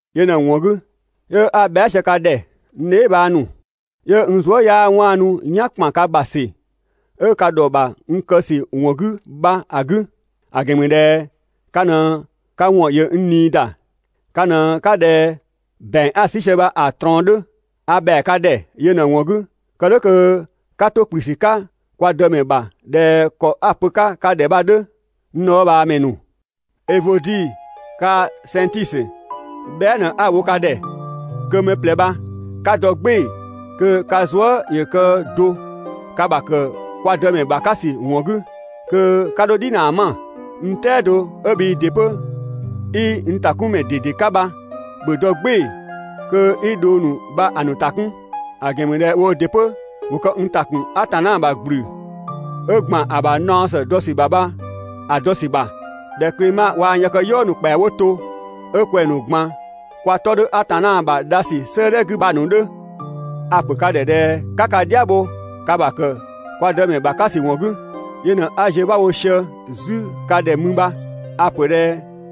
Yö ꞊në‑ ‑wɔn 'gü, 'yö 'a bhɛa" sië ka ‑dhɛ, n dheebhang ‑nu. 'Yö n zuë" 'yaa 'waanu "yan ‑kpan ka ‑bha ‑sü 'ö ka ‑dhɔ ‑bha n kë ‑sü ‑wɔn 'gü bha‑ 'gü, ‑a ‑gɛn ‑mü ꞊dhɛ ka ꞊në ka ‑wɔn ‑yö n ꞊nii ‑da, ka ꞊në 'ka ꞊dhɛ ‑bɛang 'a‑ 'sü sië bha‑ ꞊trɔɔn 'dhö. A ‑bhɛa ka ‑dhɛ yö ꞊në‑ ‑wɔn 'gü, kë "dhʋ̈ kö 'ka 'to ‑kplü ‑sü 'ka kwa Dëmɛ ‑bha ꞊dhɛ ‑kɔ 'a‑ pö‑ 'ka ka ‑dhɛ bha‑ 'dhö, n dhɔɔbhaamɛ ‑nu! Evodi kaa‑ Sɛnngtisö, bhɛa" ꞊në 'a‑ wo ka ‑dhɛ kö mɛ ꞊plɛ bha 'ka dɔ "gbɩɩ‑ kö ka zuë" ‑yö kë do ka ‑bha ‑kë kwa Dëmɛ ‑bha 'ka ‑sü ‑wɔn 'gü (kö 'ka 'dho "dhinaa 'ma). N "tɛado 'ö bhii ‑dɩ 'pö 'i n ‑takunmɛ ꞊dede 'ka bha, ‑bhö dɔ "gbɩɩ‑ kö 'i dhong ‑nu bha‑ ‑nu ‑ta 'kun, ‑a ‑gɛn ‑mü ꞊dhɛ woo ‑dɩ 'pö ‑wo kë n ‑ta ‑kun Atanna ‑bha ‑gblü 'ö ‑gban ‑a ‑bha naɔ ‑së dɔ ‑sü ‑bha bha‑ ‑a dɔ ‑sü ‑bha, ꞊dhɛ Klema waa‑ n yëkëyɔɔ ‑nu ‑kpɛa 'wo to, 'ö kwɛng‑ ‑nu ꞊gban kwa 'tɔ 'dhö Atanna ‑bha dhasü 'sëëdhɛ 'gü bha‑ ‑nu 'dhö. A‑ ‑pö ka ‑dhɛ ꞊dhɛ 'ka ka "dhia bho ka ‑bha ‑kë kwa Dëmɛ ‑bha 'ka ‑sü ‑wɔn 'gü, yö ꞊në 'a‑ ziö 'bha wo sië 'zü ka ‑dhɛ mü bha, a‑ ‑pö ꞊dhɛ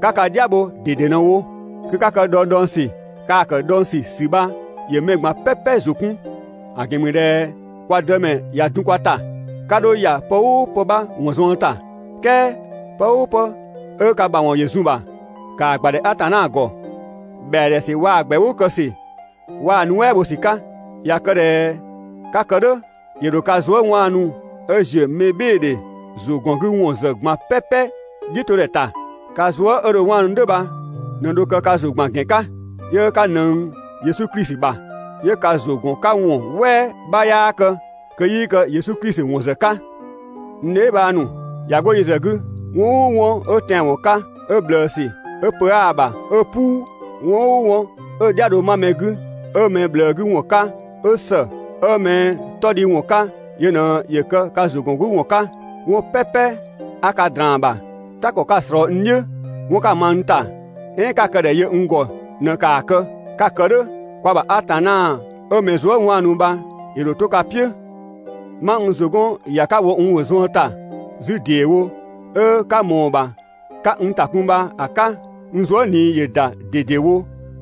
'ka ka "dhia bho ꞊dede ꞊në‑ wo. ‑Ka kë dhɔngdhɔngsü, kaa‑ ‑kë dhɔngsü ‑sü bha ‑yö mɛ ꞊gban "pɛpɛ ‑zʋ 'kun, ‑a ‑gɛn ‑mü ꞊dhɛ kwa Dëmɛ ꞊ya dun kwa ‑ta. 'Ka 'dho ‑ya pë "ʋʋ pë 'bha ‑wɔn zuën ‑ta, "kɛɛ pë "ʋʋ pë 'ö ka ‑mawɔn ‑yö zun‑ ‑bha, ‑kaa ‑gbadhɛ Atanna ‑gɔ, ‑bhɛa ‑dhɛ ‑sü waa‑ ‑gbɛʋʋ kë ‑sü, waa‑ nuɛ" bho ‑sü 'ka. ꞊Ya kë ꞊dhɛ 'ka‑ kë "dhʋ̈, ‑yö ‑dho ka zuë" 'waanu 'ö ‑ziö mɛbhɩɩdhe ‑zʋgɔngüwɔn ‑zë ꞊gban "pɛpɛ "dhiʋ̈todhɛ ‑ta. Ka zuë" 'ö dho‑ 'waanu "dhʋ̈ bha ꞊në dho kë ka ‑zʋ ‑gban ‑gɛn 'ka, 'yö 'ka ꞊nëng Yesu Klisi ‑bha, 'yö ka ‑zʋ ‑gɔn 'ka ‑wɔn "wɛɛ 'bha 'yaa kë kö 'yii kë Yesu Klisi ‑wɔn ‑zë 'ka. N dheebhang ‑nu, ꞊ya 'go yö ‑zë 'gü, 'wɔn "ʋʋ 'wɔn 'ö tɛanwɔn 'ka, 'ö ꞊bhlëësü, 'ö pö 'aa‑ ‑bha, 'ö "puu, 'wɔn "ʋʋ 'wɔn 'ö‑ "dhia‑ dho 'ma mɛ 'gü, 'ö mɛ ꞊bhlëë 'gü ‑wɔn 'ka, 'ö ‑së, 'ö mɛ 'tɔdhiwɔn 'ka yö ꞊në ‑yö kë ka ‑zʋ ‑gɔn 'ka ‑wɔn 'ka. 'Wɔn "pɛpɛ 'a ka ꞊draan‑ ‑bha, "ta ‑kɔ 'ka‑ ꞊slɔɔ n "dhiʋ̈, 'wɔn 'ka‑ ma n ‑ta, "ɛɛn 'ö 'ka‑ kë ‑dhɛ yö n ‑gɔ ꞊në‑ ‑kaa kë. 'Ka‑ kë "dhʋ̈, kwa ‑bha Atanna 'ö mɛ zuë" 'waanu bha ‑yö ‑dho 'to ka "piʋ̈. 'Ma n ‑zʋ 'gɔn ‑ya 'ka‑ wo n ‑wɔn zuën ‑ta 'zü ‑deewo, 'ö 'ka ꞊mɔɔ‑ ‑bha 'ka n ‑ta 'kun bha‑ 'ka, n zuë" ꞊nii ‑yö ‑da ꞊dedewo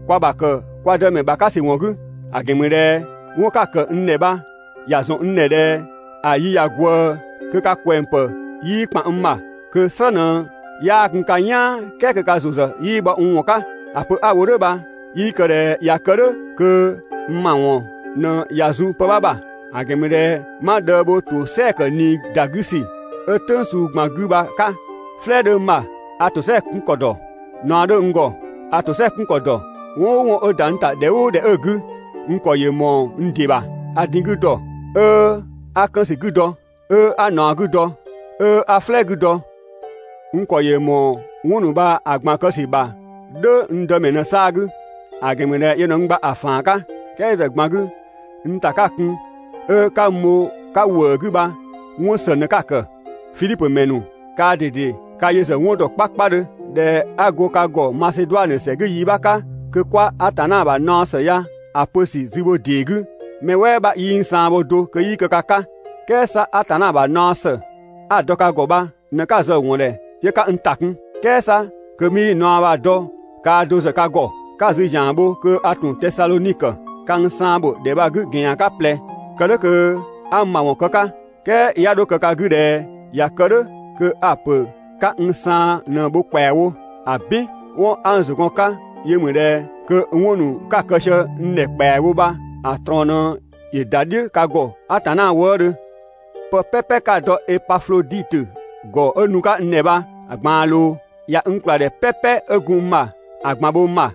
kwa ‑bha ‑kë kwa Dëmɛ ‑bha 'ka ‑sü ‑wɔn 'gü. ‑A ‑gɛn ‑mü ꞊dhɛ 'wɔn 'ka‑ ‑kë n ‑dhɛ bha ‑ya ‑zɔn n ‑dhɛ ꞊dhɛ ‑a yi ꞊ya ꞊gwëë kö ka ꞊kwɛng ‑pë 'yii ‑kpan n ‑bha, kö‑ "slë ꞊në 'yaa gun ka "yaan "kɛɛ kö ka ‑zʋ ‑zë 'yii bhɔ n ‑wɔn 'ka. ‑A pö 'a‑ wo "dhʋ̈ bha 'yii kë ꞊dhɛ ꞊ya kë "dhʋ̈ kö n ‑mawɔn ꞊në ꞊ya zun pë 'bha ‑bha. ‑A ‑gɛn ‑mü ꞊dhɛ 'ma dhëë bho ‑tosɛa ‑kë ꞊nii ‑da 'gü ‑sü 'ö "tʋ̈ng suu ꞊gban 'gü bha‑ 'ka. "Flɛɛ 'dhö n ‑bha, a ‑tosɛa 'kun ‑kɔ ‑dɔ, ꞊naɔ 'dhö n ‑gɔ a ‑tosɛa 'kun ‑kɔ ‑dɔ. 'Wɔn "ʋʋ 'wɔn 'ö ‑da n ‑ta ‑dhɛ "ʋʋ ‑dhɛ 'ö‑ 'gü, n ‑kɔ ‑yö ‑mɔɔ n ‑dɩ ‑bha. A din‑ 'gü ‑dɔ, 'ö 'a 'kën ‑sü 'gü dɔ, 'ö 'a ꞊naɔ 'gü dɔ, 'ö 'a "flɛɛ 'gü dɔ. N ‑kɔ ‑yö ‑mɔɔ 'wɔn ‑nu bha‑ ꞊gban kë ‑sü ‑bha "dhʋ̈ n Dëmɛ ꞊në‑ 'saa‑ 'gü, ‑a ‑gɛn ‑mü ꞊dhɛ yö ꞊në n gba‑ ‑faan 'ka. "Kɛɛ yö ‑zë ꞊gban 'gü, n ‑ta 'ka‑ kun 'ö 'ka n bho‑ 'ka ‑wëë 'gü bha 'wɔn ‑së ꞊në‑ 'ka‑ ‑kë. Fidhipö ‑mɛ ‑nu, kaa ꞊dede ka yö ‑zë 'wɔn ‑dɔ 'kpakpadhö, ꞊dhɛ 'a go ka ‑gɔ Maseduanö ‑sɛ 'gü yi 'bha 'ka, kö 'kwa Atanna ‑bha naɔ ‑së ya‑ pö ‑sü zü bho ‑dee 'gü, mɛ "wɛɛ 'bha 'yii n saan bho do kö 'yii kë ka 'ka. "Kɛɛ 'sa Atanna ‑bha naɔ ‑së 'a‑ dɔ ka ‑gɔ bha ꞊në 'ka zë‑ ‑wɔn ‑dhɛ 'yö 'ka n ‑ta 'kun, "kɛɛ 'sa kö 'mii naɔ bha‑ dɔ kaa do ‑zë ka ‑gɔ. Ka‑ zü ‑zian ‑bho kö a ‑tun Tesadhonikö. Ka n saan ‑bho ‑dhɛ bha‑ 'gü ‑gɛn ‑yan 'ka ꞊plɛ, kë "dhʋ̈ kö 'a n ‑mawɔn kë‑ 'ka. "Kɛɛ 'ya 'dho kë ka 'gü ꞊dhɛ ꞊ya kë "dhʋ̈ kö a‑ ‑pö 'ka n saan ꞊në‑ bho ‑kpɛawo. ‑Abin! 'Wɔn 'a n ‑zʋ gɔn‑ 'ka yö ‑mü ꞊dhɛ kö 'wɔn ‑nu 'ka‑ kë sië n ‑dhɛ ‑kpɛawo bha‑ ꞊trɔɔn ꞊në ‑yö ‑da "dhiʋ̈ ka ‑gɔ Atanna wëëdhö. Pë "pɛpɛ 'ka‑ dɔ Epafloditö ‑gɔ 'ö nu‑ 'ka n ‑dhɛ bha‑ ꞊gbaan ꞊loo, ꞊ya n ‑kpla ‑dhɛ "pɛpɛ 'ö gun n ‑bha ‑a ꞊gban bho n ‑bha,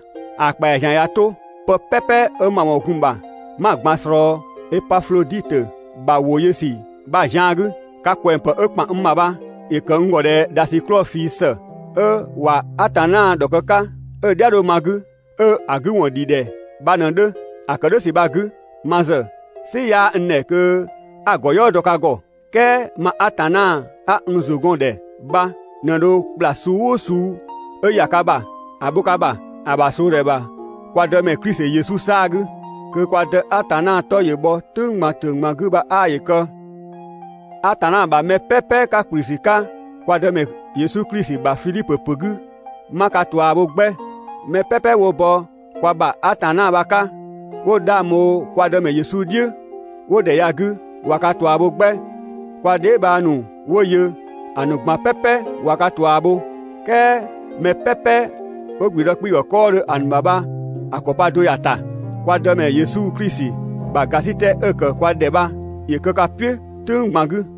‑a ‑kpɛa ‑zian ꞊ya 'to, pë "pɛpɛ 'ö n ‑mawɔn gun‑ ‑bha 'ma‑ ꞊gban ꞊slɔɔ Epafloditö ‑bha ‑wo yö ‑sü bha‑ zian 'gü. Ka ꞊kwɛng pë 'ö ‑kpan n ‑bha bha ‑yö ‑kë n ‑gɔ ꞊dhɛ ‑dhasiklɔɔ ꞊fii ‑së 'ö ꞊wa Atanna ‑dhɔ kë‑ 'ka 'ö‑ "dhia‑ ma‑ 'gü, 'ö‑ 'gü ‑wɔn ‑dhi ‑dhɛ bha ꞊në‑ 'dhö. (‑A ‑kë "dhʋ̈ ‑sü bha‑ 'gü, ma ‑zë "sɩ 'yaa n ‑dhɛ kö 'a‑ ‑gɔ "yɔɔ dɔ ka ‑gɔ,) "kɛɛ ma Atanna 'a n ‑zʋ gɔn‑ ‑dhɛ bha ꞊në dho ‑kpla suu "ʋʋ suu 'ö ‑ya ka ‑bha ‑a bho ka ‑bha ‑a ‑bha ꞊sloodhɛ ‑bha kwa Dëmɛ Klisi Yesu 'saa‑ 'gü. Kö kwa Dë Atanna 'tɔ ‑yö bhɔ "tʋ̈ng ꞊gban 'gü bha 'aa ‑yö kë! Atanna ‑bha mɛ "pɛpɛ 'ka ‑kplü ‑sü 'ka kwa Dëmɛ Yesu Klisi ‑bha Fidhipö ‑pö 'gü 'ma ka ꞊tua bho 'gbɛ! Mɛ "pɛpɛ 'wo bɔ kwa ‑bha Atanna bha‑ 'ka 'wo 'dhang bho kwa Dëmɛ Yesu "dhiʋ̈ 'wo ‑dhɛ ya‑ 'gü ꞊wa ka ꞊tua bho 'gbɛ. Kwa dheebhang ‑nu 'wo yö ‑a ‑nu ꞊gban "pɛpɛ ꞊wa ka ꞊tua bho, "kɛɛ 'mɛ "pɛpɛ 'wo ‑gblüdë 'kpii‑ ‑gɔ 'kɔɔdhö ‑a ‑nu ‑bha bha‑ ‑kɔ pa do ‑ya ‑ta. Kwa Dëmɛ Yesu Klisi ‑bha ‑gasitɛ 'ö‑ ‑kë kwa ‑dhɛ bha ‑yö kë ka "piʋ̈ "tʋ̈ng ꞊gban 'gü.